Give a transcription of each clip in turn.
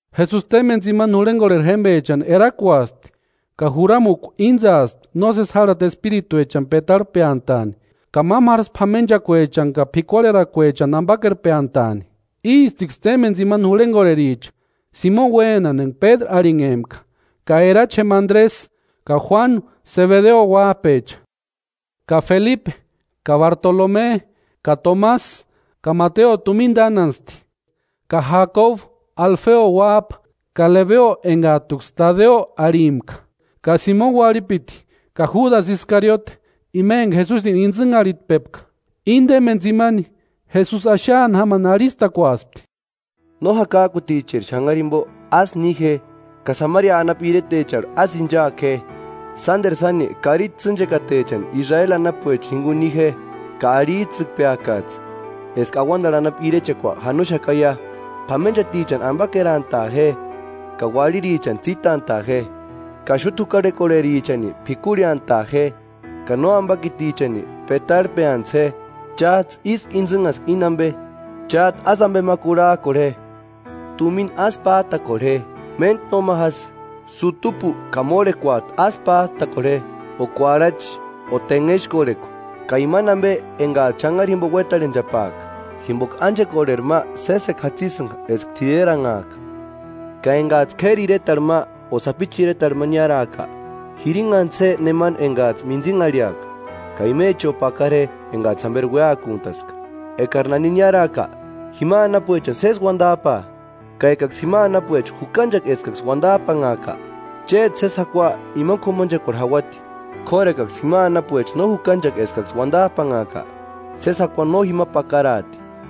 Jesusi témpeni tsimani jurhenkorheri jémpechani erakuaspti, ka juramukua íntsaaspti nósesi jarhati espirituechani petarhpeantaani, ka mámaru jásï p'amenchakuechani ka p'ikuarherakuechani ampakerpeantaani. Ístiksï témpeni tsimani jurhenkorhericha: Simoni uénani enka Pédru arhinhempka; ka erachi jémpa Andresï; ka Juánu, Sebedeo uáp'echa; ka Felipe ka Bartolome ka Tomasï; ka Mateo tumina tánantsti; ka Jakobu Alfeo uáp'a; ka Lebeo enkat'uksï Tadeo arhimpka; ka Simoni uarhipiti ka Júdasï Iskariote, ima enka Jesusini intsïnharhitpepka. Íni témpeni tsimani, Jesusi axaani jámani arhistakuaspti: “No jakak'uticheri xanhari jimpo ásï ni je, ka Samaria anapu iretecharhu ásï inchaaku je, sánteru sáni karichi tsînchekatecha Israeli anapuecha jinkuni ni je. Ka arhits'ïkpeakats'ï eska auantarhu anapu irechekua janoxakaia. P'amenchatichani ampakerantaa je, ka uarhirichani tsítant'a'a je, ka xúta jukarhekorherichani p'ikurheantaa je, ka nóampakitichani petarhpeantsï je. Cháts'ï ísku intsïnhaska íni ampe, chát'u ásï ampe ma kurhak'orhe je.” “Tumina ásï p'át'akorhe je, méntku nóma jásï; sutupu ka mórhekorhekuat'u ásï pát'akorhe je, o kuarhachi o tenhexkorhekua ka imani ampe enkats'ï xanhari jimpo uétarhenchapaaka, jimpoka ánchekorheri ma sésekua jatsisïnka eska t'ireranhaaka. Ka enkats'ï k'éri iretarhu ma o sapichu iretarhu ma niáraaka, jirinhantsï je nemani enkats'ï mintsinharhiaka, ka imecho pakara je enkats'ï jamperi uéakuntaska. Ekari nani niáraaka, jima anapuechani sési uantap'aa. Ka ekaksï jima anapuecha jukanchaka eskaksï uantap'anhaaka, chéti sési jakua imani k'umanchekuarhu jauati; k'óru ekaksï jima anapuecha no jukanchaka eskaksï uantap'anhaaka, sési jakua no jima pakaraati.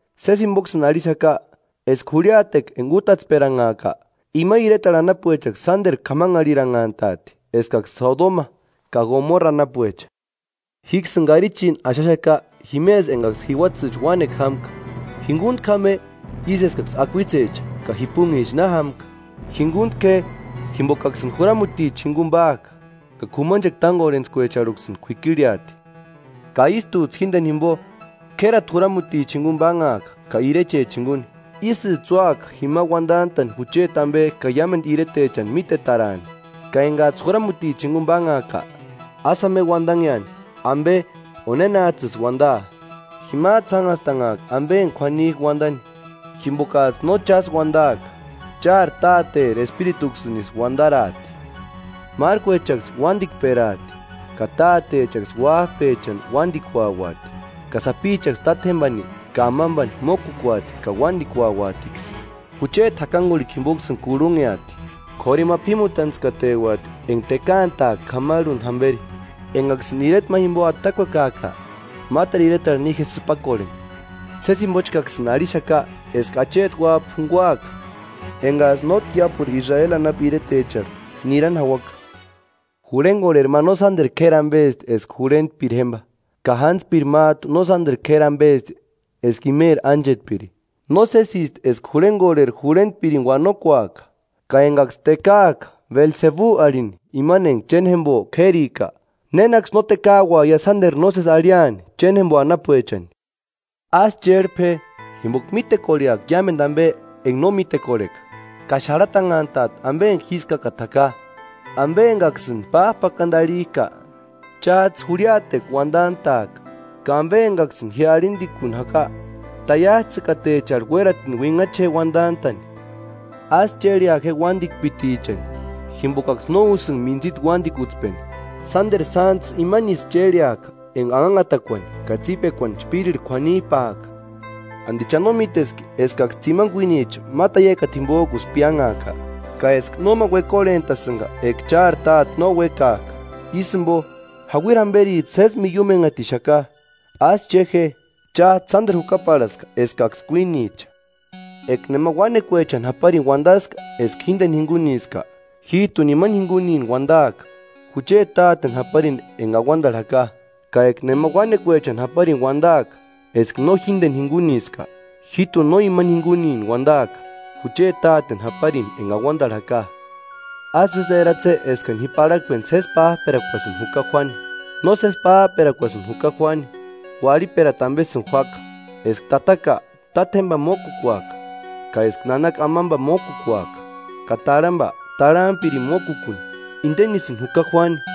Sési jimpoksïni arhixaka eska jurhiatekua enka útatsperanhaaka, ima iretarhu anapuechaksï sánteru k'amanharhiranhant'aati eskaksï Sodoma ka Gomorra anapuecha.” “Jíksïni karichini axaxaka jimesï enkaksï jiuatsïcha uánekua jámka, jinkuntku jáma je, ísï eskaksï akuitsecha ka jipunicha na jámka.” “Jinkuntku je, jimpokaksïni juramuticha jinkuni páaka, ka k'umanchekua tánkorhentskuecharhuksïni k'uikirheati, ka ístuts'ï jínteni jimpo k'érati juramuticha jinkuni pánhaaka ka irechecha jinkuni; ísïts'ï úaka jima uantant'a'ni jucheti ampe ka iámentu iretechani mítetaraani. Ka enkats'ï juramutichani jinkuni pánhaaka, ásï jáma je uantanheani ampe o nénats'ïsï uantaa, jimats'ï jánhastanhaaka ampe enka k'uanik'a uantani, jimpokats'ï no chásï uantaaka, chári Táteri Espirituksïnisï uantaraati.” “Márkuechaksï uantikperaati, ka tátechaksï uáp'echani uantikuauati, ka sapichaksï tátjempani ka amampani mókukuati ka uántikuauatiksï. Jucheti jakankurhikua jimpoksïni kurhunheati; k'óru ima p'ímutantskateuati enka tekaantaaka k'amarhuni jamperi. Enkaksïni ireta ma jimpo atakuekaaka, máteru iretarhu ni je sïpakorheni. Sési jimpochkaksïni arhixaka eska Acheti Uáp'a junkuaka enkats'ï nótki iápuru Israeli anapu iretecharhu nirani jauaka.” “Jurhenkorheri ma no sánteru k'éri ampesti eska jurhentpiri jémpa, ka jántspiri mát'u no sánteru k'éri ampesti eska imeri ánchetpiri. Nósesisti eska jurhenkorheri jurhentpirini uanokuaka. Ka enkaksï tekaak'a Belsebu arhini imani enka chéni jémpo k'érika, ¡Nénaksï no tekauaia sánteru nósesi arhiani chéni jémpo anapuechani!” “Ásï chérhpe je, jimpoka mítekorheaka iámentu ampe enka no mítekorheka, ka xarhatanhantaati ampe enka jískakata jaka. Ampe enkaksïni páp'akantu arhik'a, cháts'ï jurhiatekua uantant'a'aka, ka ampe enkaksïni ji arhintikuni jaka, taiats'ïtakatecharhu uératini uinhacha je uantant'a'ni. Ásï chérhea je uántikpitichani, jimpokaksï no úsïnka mintsita uántikutspeni; sánteru sántsï imanisï chérheaka enka anhanhatakuani ka tsípekuani chpírirhu k'uanip'ak'a. ¿Anti cha no míteski, eskaksï tsimani kuínicha ma taiakata jimpok'usï piánhak'a? Ka eska nóma uekorhent'asïnka eka chári Táte no uékaaka. Ísï jimpo, jauiri jamperits'ï sési miiumenhatixaka. Ásï che je: Cháts'ï sánteru jukaparhaska eskaksï kuínicha.” “Eka nema uánekuechani japarini uantaska eska jínteni jinkuniska, jít'uni ima jinkunini uantaaka jucheti Táteni japarini enka auantarhu jaka. Ka eka nema uánekuechani japarini uantaaka eska no jínteni jinkuniska, jít'uni no ima jinkunini uantaaka jucheti Táteni japarini enka auantarhu jaka.” “Ásï ísï eratse je eskani ji parhakpeni sési páp'erakuasï juka juáni, nósesi páp'erakuasïni juka juáni, uarhiperata ampesïni juáka. Eska tataka, tátjempani mókukuaka, ka eska nanaka amampani mókukuaka, ka tarhampa tarhampirini mókukuni, intenisïni juka juáni.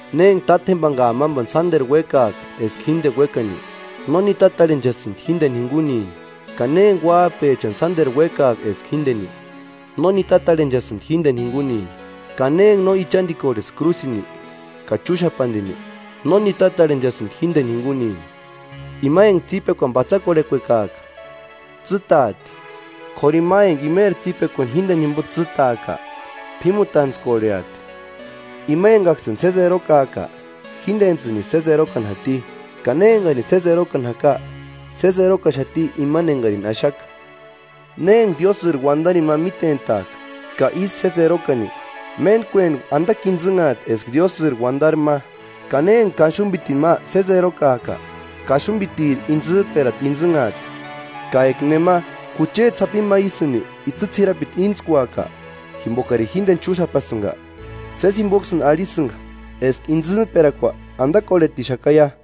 “Ne enka tátjempani ka amampani sánteru uékaaka eska jínteni uékani, no nitatarhenchasïnti jínteni jinkunini, ka ne enka uáp'echani sánteru uékaaka eska jínteni, no nitatarhenchasïnti jínteni jinkunini. Ka ne enka no ichantikorheaka krúsini ka chúxapantini, no nitatarhenchasïnti jínteni jinkunini. Ima enka tsípekuani patsakorhekuekaaka, tsîtaati, k'óru ima enka imeri tsípekuani jínteni jimpo tsîtaaka, p'ímutantskorheati.” “Ima enkaksïni sési erokaaka, jíntentsïnisï sési erokani jati, ka ne enkarini sési erokani jaka, sési erokaxati imani enkarini axaka. Ne enka Diósïri uantarini ma mítent'aakaka ísï sési erokani, méntkueni antakua intsïnhaati eska Diósïri uantari ma, ka ne enka kaxumpitini ma sési erokaaka, kaxumpitiri itsïmperata intsïnhaati. Eka nema, jucheti sapini ma ísïni itsï ts'irapiti íntskuaka, jimpokarini jínteni chúxapasïnka, sési jimpoksïni arhisïnka eska intsïmperakua antakorhetixakaia.”